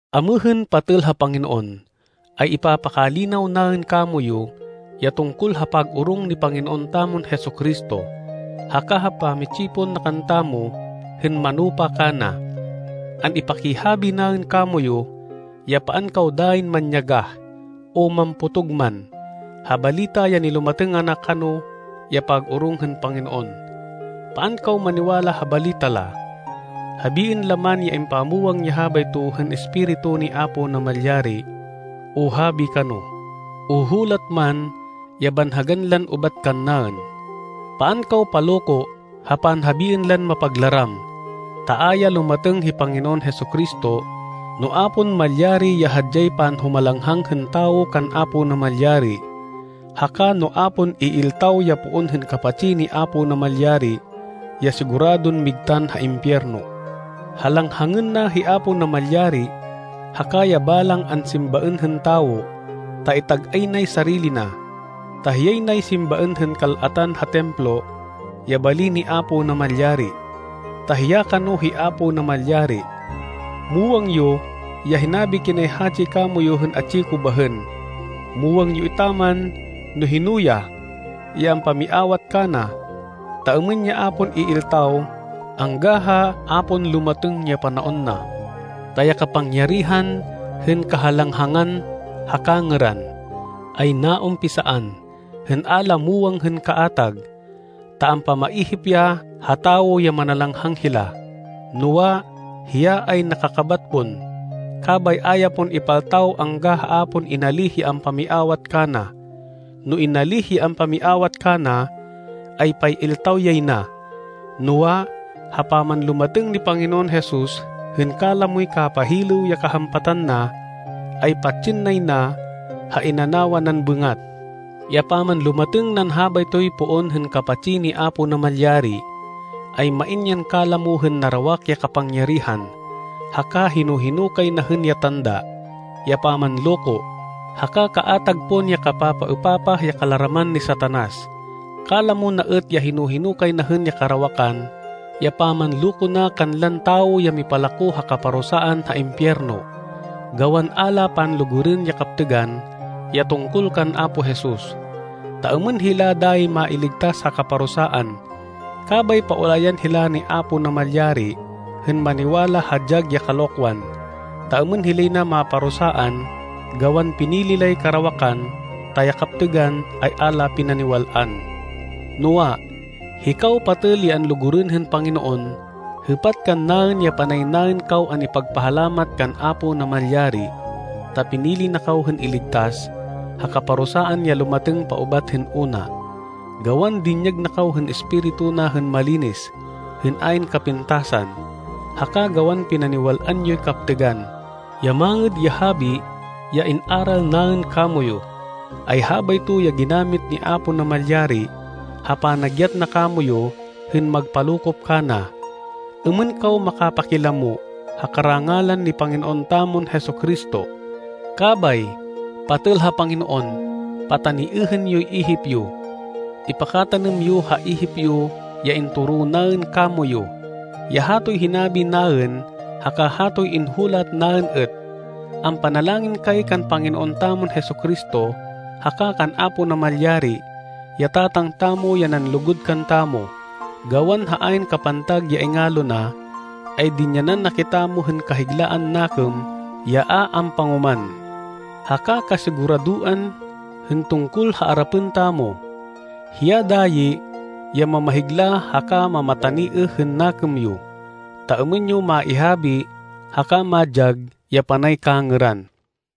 Amêhên, patêl ha Panginoon, ay ipapakalinaw naên kamoyu ya tungkol ha pag-orong ni Panginoon tamon Jesu-Cristo, haka ha pamitsipon na kantamo hên manupa kana. An-ipakihabi naên kamoyu ya paan kaw dayin manyagah o mampotog man, ha balita ya nilumatêng ana kano ya pag-orong hên Panginoon. Paan kaw maniwala ha balita la, habiên la man ya impamwang ya habayto hên Espiritu ni Apo Namalyari, o habi kano, o hulat man ya banhagan lan ubat kannaên. Paan kaw paloko ha panhabiên lan mapaglaram, ta a ya lumatêng hi Panginoon Jesu-Cristo, no a pon malyari ya hadyay panhumalanghang hên tawo kan Apo Namalyari, haka no a pon iiltaw ya poon hên kapatsi ni Apo Namalyari, ya siguradon migtan ha impiyerno. Halanghangên na hi Apo Namalyari haka ya balang ansimbaên hên tawo, ta itag-ay nay sarili na, ta hiyay nay simbaên hên kal-atan ha Templo, ya bali ni Apo Namalyari, ta hiya kano hi Apo Namalyari. Muwang yo ya hinabi kinay hatsi kamoyu hên atsi ko bahên. Muwang yo etaman no hino ya, ya ampamiawat kana, ta êmên ya a pon iiltaw angga ha a pon lumatêng ya panaon na. Ta ya kapangyarihan hên kahalanghangan ha kangêran, ay naumpisaan hên a la muwang hên kaatag, ta ampamaihip ya ha tawo ya manalanghang hila, noa, hiya ay nakakabat pon, kabay a ya pon ipaltaw angga ha a pon inalíh ya ampamiawat kana. No inalíh ya ampamiawat kana, ay pay-iltaw yay na. Noa, ha pamanlumatêng ni Panginoon Jesus hên kalamoy kapahilêw ya kahampatan na, ay patsên nay na ha inanawa nan bêngat. Ya pamanlumatêng nan habaytoy poon hên kapatsi ni Apo Namalyari, ay main yan kalamo hên narawak ya kapangyarihan, haka hino-hino kay na hên ya tanda, ya pamanloko, haka kaatag pon ya kapapaêpapah ya kalaraman ni Satanas. Kalamo na êt ya hino-hino kay na hên ya karawakan ya pamanloko na kanlan tawo ya mipalako ha kaparusaan ha impiyerno, gawan a la panlugurên ya kaptêgan ya tungkol kan Apo Jesus, ta êmên hila dayi mailigtas ha kaparusaan. Kabay paulayan hila ni Apo Namalyari hên maniwala ha dyag ya kalokwan, ta êmên hilay na maparusaan gawan pinili lay karawakan, ta ya kaptêgan ay a la pinaniwal-an. Noa, hikaw, patêl ya anlugurên hên Panginoon, hêpat kannaên ya panay naên kaw an-ipagpahalamat kan Apo Namalyari ta pinili na kaw hên iligtas ha kaparusaan ya lumatêng paubat hên una, gawan dinyag na kaw hên Espiritu na hên malinis, hên ayn kapintasan, haka gawan pinaniwal-an yoy kaptêgan. Ya Mangêd ya Habi ya in-aral naên kamoyu, ay habayto ya ginamit ni Apo Namalyari ha panagyat na kamoyu hên magpalokop kana, êmên kaw makapakilamo ha karangalan ni Panginoon tamon Jesu-Cristo. Kabay, patêl ha Panginoon, pataniêhên yoy ihip yo. Ipakatanêm yo ha ihip yo ya intoro naên kamoyu, ya hatoy hinabi naên haka hatoy inhulat naên êt. Ampanalangin kay kan Panginoon tamon Jesu-Cristo haka kan Apo Namalyari, ya Tatang tamo ya nanlugud kantamo. Gawan ha ayn kapantag ya ingalo na, ay dinyanan na kitamo hên kahiglaan nakêm ya a ampangoman, haka kasiguradoan hên tungkol ha arapên tamo. Hiya dayi, ya mamahigla haka mamataniêh hên nakêm yo, ta êmên yo maihabi haka madyag ya panay kangêran.